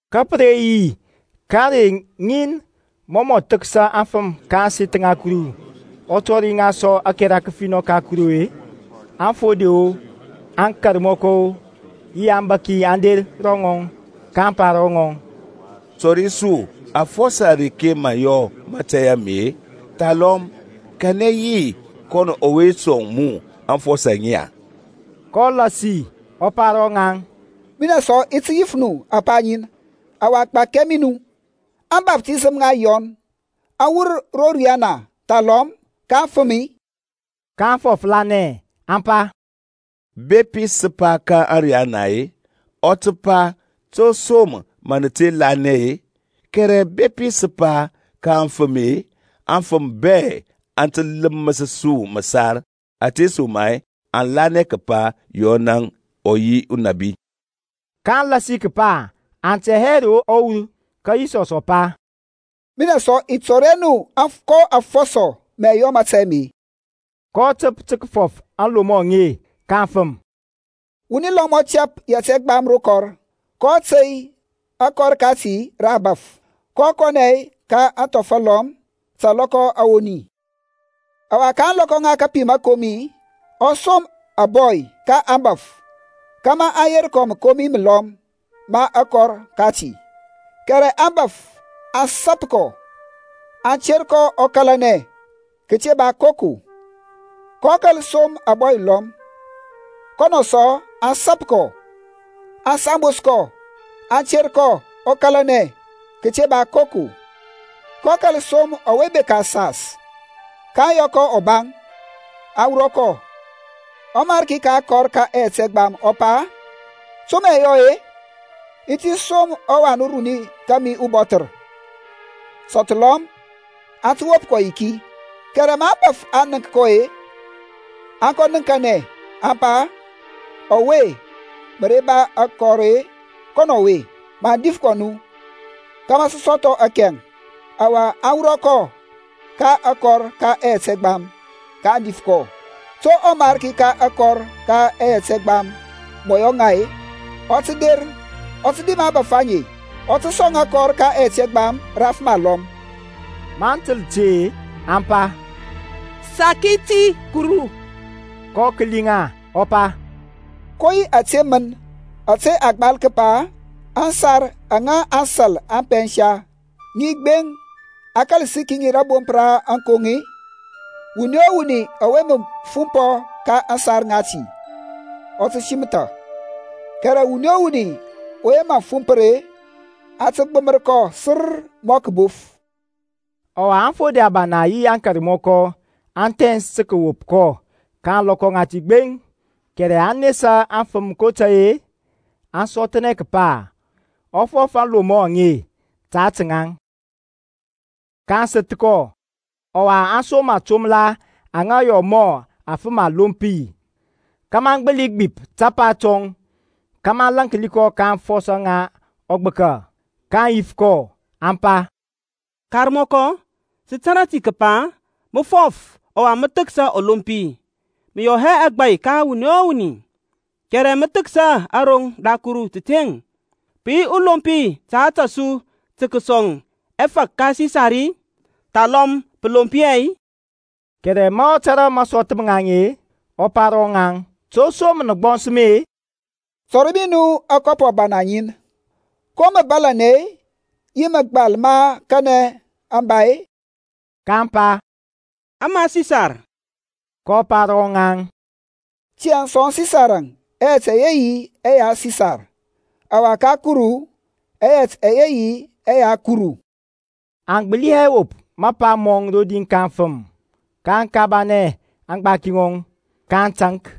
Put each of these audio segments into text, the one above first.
Ka pə re yi ka ȧrey ŋin mɔ mɔ thəksa aŋfəm ka ȧŋseth ŋa Kuru, ɔ tɔri ŋa sɔ ȧkɛra kəfinɔ ka Kuru-e, aŋfode-o, aŋkarmɔkɔ-o yi aŋbȧki aŋ der ro ŋɔŋ, kaŋ pa ro ŋɔŋ, Tɔri su afɔsɔ areke mȧ mə yɔ mȧtȧy ame, thalɔm kanɛ yi kɔn ɔwe sɔŋ mu aŋfɔsɔ aŋe-e? kɔ lasi ɔ pa ro ŋaŋ, Minɛŋ sɔ i ti yif nu apa ŋin, ɔwa gbakia mi nu. Ȧŋbaftisəm ŋa Yɔn aŋ wur ro riyana thalɔm ka afəm-i? kaŋ fɔflanɛ aŋ pa, Bepi sə pa, Ka ȧriyana-e, ɔ tə pa, To som mən nə te kɔ lanɛ-e? Kɛrɛ bepi sə pa, Ka afəm-e, aŋfəm bɛ aŋ tə ləməs su məsar, ȧtesoma-e aŋ lanɛ kəpa Yɔnȧŋ ɔ yi unabi. kaŋ lasi kəpa aŋ tɛ hɛ ro aŋ wur. Ka Yisɔsȧŋ ɔ pa, Minɛ sɔ i tɔri hɛ nu ko afɔsɔ mə i yɔ mȧtȧy ame. kɔ təp tə kəfɔf aŋlomɔ aŋe ka aŋfəm. Wuni lɔm ɔ tɛp yɛt ɛgbam rə kɔr, kɔ tey akɔr kati rə abȧf, kɔ kɔnɛ ka athɔf alɔm ta alɔkɔ awoni. Ɔwa ka ȧŋlɔkɔ ŋa kapim məkomi ɔ som ȧbɔy ka aŋbȧf kȧmȧ aŋ yer kɔ mȧkomi məlɔm ma akɔr kati; kɛrɛ aŋbȧf aŋ sap kɔ, aŋ ter kɔ ɔ kȧlanɛ kəte ba koko. kɔ kȧl som ȧbɔy alɔm; kɔnɔ sɔ aŋ sap kɔ, aŋ sambos kɔ, aŋ ter kɔ ɔ kȧlanɛ kəte ba koko. kɔ kȧl som ɔwe bekȧ asas, kaŋ yɔ kɔ ɔbaŋ, aŋ wurɔ kɔ. Ɔmariki ka akɔr ka ɛyɛt ɛgbam ɔ pa, To mə i yɔ-e? I ti som ɔwan uruni kȧmi ubɔthər; sɔthlɔm aŋ tə wop kɔ yiki. Kɛrɛ ma aŋbȧf aŋ nənk kɔ-e, aŋ kɔ nəŋkanɛ, aŋ pa, Ɔwe mə re ba akɔr-e, kɔnɔ ɔwe, maŋ dif kɔ nu, kȧmȧ sə sɔthɔ akɛŋ. Ɔwa aŋ wurɔ kɔ ka akɔr ka ɛyɛt ɛgbam, kaŋ dif kɔ. To ɔmarki ka akɔr ka ɛyɛt ɛgbam mɔ yɔ ŋa-e? Ɔ tə der, ɔ tə dim aŋbȧf aŋe, ɔ tə sɔŋ akɔr ka ɛyɛt ɛgbam rə afəm alɔm. Maŋ təl ti-e aŋ pa, Saki ti Kuru. kɔ kəli ŋa ɔ pa, Ko yi ȧte mən ȧtȧ a gbal kəpa, Aŋsar aŋa aŋsȧl aŋ pɛnsa, Ŋi gbeŋ, a kȧl səki ŋi rȧbomp ra aŋkoŋ-e? Wuni o wuni ɔwe mə fumpɔ ka aŋsar ŋati, ɔ tə simətha, kɛrɛ wuni o wuni ɔwe mə aŋ fumpər-e, aŋ tə gbəm kɔ sər mɔ kəbof. Ɔwa aŋfode abana yi aŋkarmɔkɔ aŋ thɛns tə kəwop kɔ ka ȧŋlɔkɔ ŋati gbeŋ, kɛrɛ aŋ nesa aŋfəm kotȧy-e aŋ sɔthnɛ kəpa ɔ fɔf aŋlomɔ aŋe ta ȧtȧ ŋaŋ. kaŋ səth kɔ, ɔwa aŋ som atombəla aŋa yɔ mɔ afəm alompi kȧmȧ aŋ gbəli gbip tapa tɔŋ, kȧmȧ aŋ lȧnki kɔ ka aŋfɔsɔ ŋa ɔgbəka. kaŋ yif kɔ aŋ pa, Karmɔkɔ, sə tȧrȧ ti kəpa mə fɔf ɔwa mə thəksa ɔlompi, mə yɔ hɛ agbȧy ka wuni o wuni, kɛrɛ mə thəksa aroŋ ra Kuru təteŋ. Pə yi ɔlompi ta ȧtȧ su tə kəsɔŋ ɛfȧk ka Sisar-i, thalɔm pə lomp hɛ-i? Kɛrɛ ma ɔ tȧrȧ masɔth ma ŋaŋ-e, ɔ pa ro ŋaŋ, To som nə gbɔns mi-e? Tɔri mi nu akɔpɔ abana ŋin. Ko mȧbȧlȧnɛ-e, yi mȧgbal ma kanɛ aŋ ba-e? kaŋ pa, Ama Sisar. kɔ pa ro ŋaŋ, Tiyȧŋ sɔŋ Sisarȧŋ ɛyɛt ɛyɛ yi ɛya Sisar, ɔwa ka Kuru ɛyɛt ɛyɛ yi ɛya Kuru. Aŋ gbəli hɛ wop mapa mɔŋ rodi ka aŋfəm, kaŋ kabanɛ aŋgbaki ŋɔŋ, kaŋ taŋk.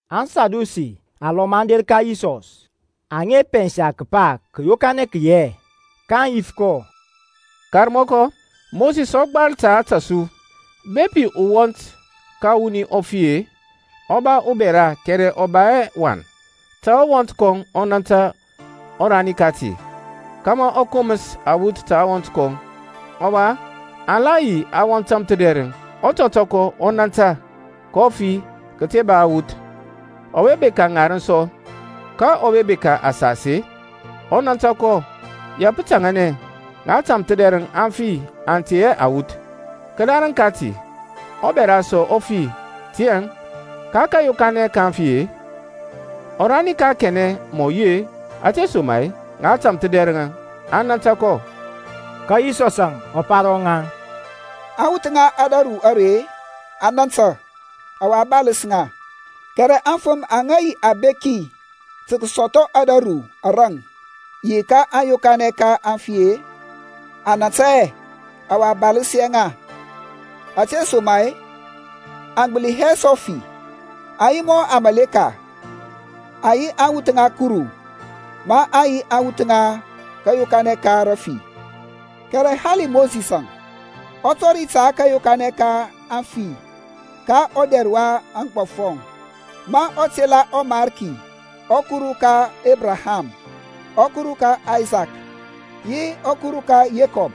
ASadusi alɔm aŋ der ka Yisɔs, aŋa pɛnsa kəpa kȧyokanɛ kə yi hɛ. Kaŋ yif kɔ, Karmɔkɔ, Mosis ɔ gbal ta ȧtȧ su, Bepi uwɔnt ka wuni ɔ fi-e, ɔ ba ubɛra kɛrɛ ɔ ba hɛ wan, ta ɔwɔnt kɔŋ ɔ nȧntȧ ɔrani kati, kȧmȧ ɔ koməs awuth ta ɔwɔnt kɔŋ. Ɔwa aŋ la yi awɔnt tȧmthədɛrəŋ. Ɔtɔtɔkɔ ɔ nȧntȧ, kɔ fi kəte ba awuth. Ɔwa bekȧ ŋarəŋ sɔ; ka ɔwe bekȧ asas-e ɔ nȧntȧ kɔ; ya pə taŋanɛ, ŋa tȧmthədɛrəŋȧŋ aŋ fi aŋ tey hɛ awuth. Kədarəŋ kati ɔbɛra sɔ ɔ fi. Tiyȧŋ ka kȧyokanɛ ka aŋfi-e, ɔrani ka kanɛ mɔ yi-e? Ȧtesoma-e ŋa tȧmthədɛrəŋ aŋ nȧntȧ kɔ. Ka Yisɔsȧŋ ɔ pa ro ŋaŋ, Aŋwuth ŋa ȧdȧru are aŋ nȧntȧ, ɔwa a baləs ŋa; kɛrɛ aŋfəm aŋa yi abeki tə kəsɔthɔ ȧdȧru araŋ yi kȧyokanɛ ka aŋfi-e, aŋ nȧntȧ hɛ, ɔwa a baləs hɛ ŋa; ȧtesoma-e aŋ gbəli hɛ sɔ fi, aŋ yi mɔ aŋmȧleka; aŋ yi awuth ŋa Kuru, maŋ yi aŋwuth ŋa kȧyokanɛ ka rafi. Kɛrɛ hali Mosisȧŋ ɔ tɔri ta kȧyokanɛ ka aŋfi ka ɔdɛr ka aŋgbɔfɔŋ, ma ɔ tela ɔMarki ɔKuru ka Ebraham, ɔKuru ka Aysakȧŋ yi ɔKuru ka Yekɔb.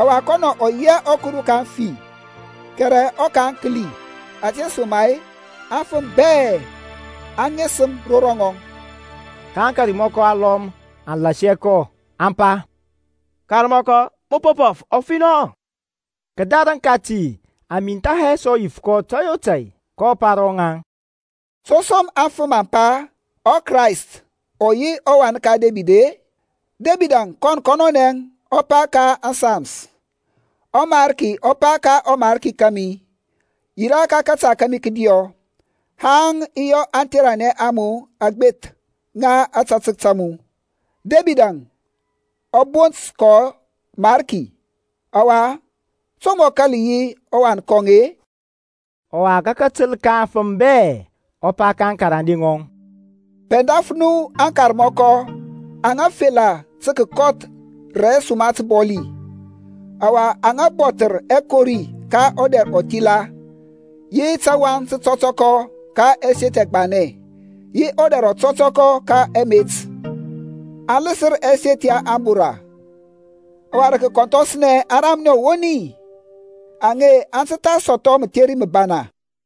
Ɔwa kɔnɔ ɔ yi hɛ ɔKuru ka aŋfi, kɛrɛ ɔka aŋkəli, ȧtesoma-e aŋfəm bɛ aŋ ŋesəm ro rɔŋɔŋ. Ka aŋkarmɔkɔ alɔm aŋ lasi kɔ aŋ pa, Karmɔkɔ, mə po fɔf ɔfinɔ. Kədarəŋ kati aŋ mintha hɛ sɔ yif kɔ tȧy o tȧy. kɔ pa ro ŋaŋ, To som aŋfəm aŋ pa ɔKrayst ɔ yi ɔWan ka Debid-e? Debidȧŋ kɔŋ kɔnɔnɛ ɔ pa ka ȧŋSams, ƆMariki ɔ pa ka ɔMarki kȧmi, Yirȧ ka kȧta kȧmi kədiɔ, Haŋ i yɔ aŋtheranɛ a mu aŋgbeth ŋa ȧtȧtək ta mu. Debidȧŋ ɔ bont kɔ Mariki. Ɔwa to mɔ kȧl yi ɔwan kɔŋ-e? Ɔwa ka katəl ka aŋfəm bɛ, ɔ pa ka aŋkarande ŋɔŋ, Pɛndaf nu aŋkarmɔkɔ aŋa fela tə kəkɔth rə suma təbɔli, ɔwa aŋa bɔthər ɛkori ka ɔdɛr ɔthila, yi tawaŋ tətɔtɔkɔ ka ɛseth ɛgbanɛ, yi ɔdɛr ɔtɔtɔkɔ ka ɛmet. Aŋ ləsər ɛseth ya ȧŋbora, ɔwa rə kəkɔnthɔsnɛ aŋ ramnɛ ɔwoni. Aŋe aŋ tə tha sɔthɔ mətheri məbana.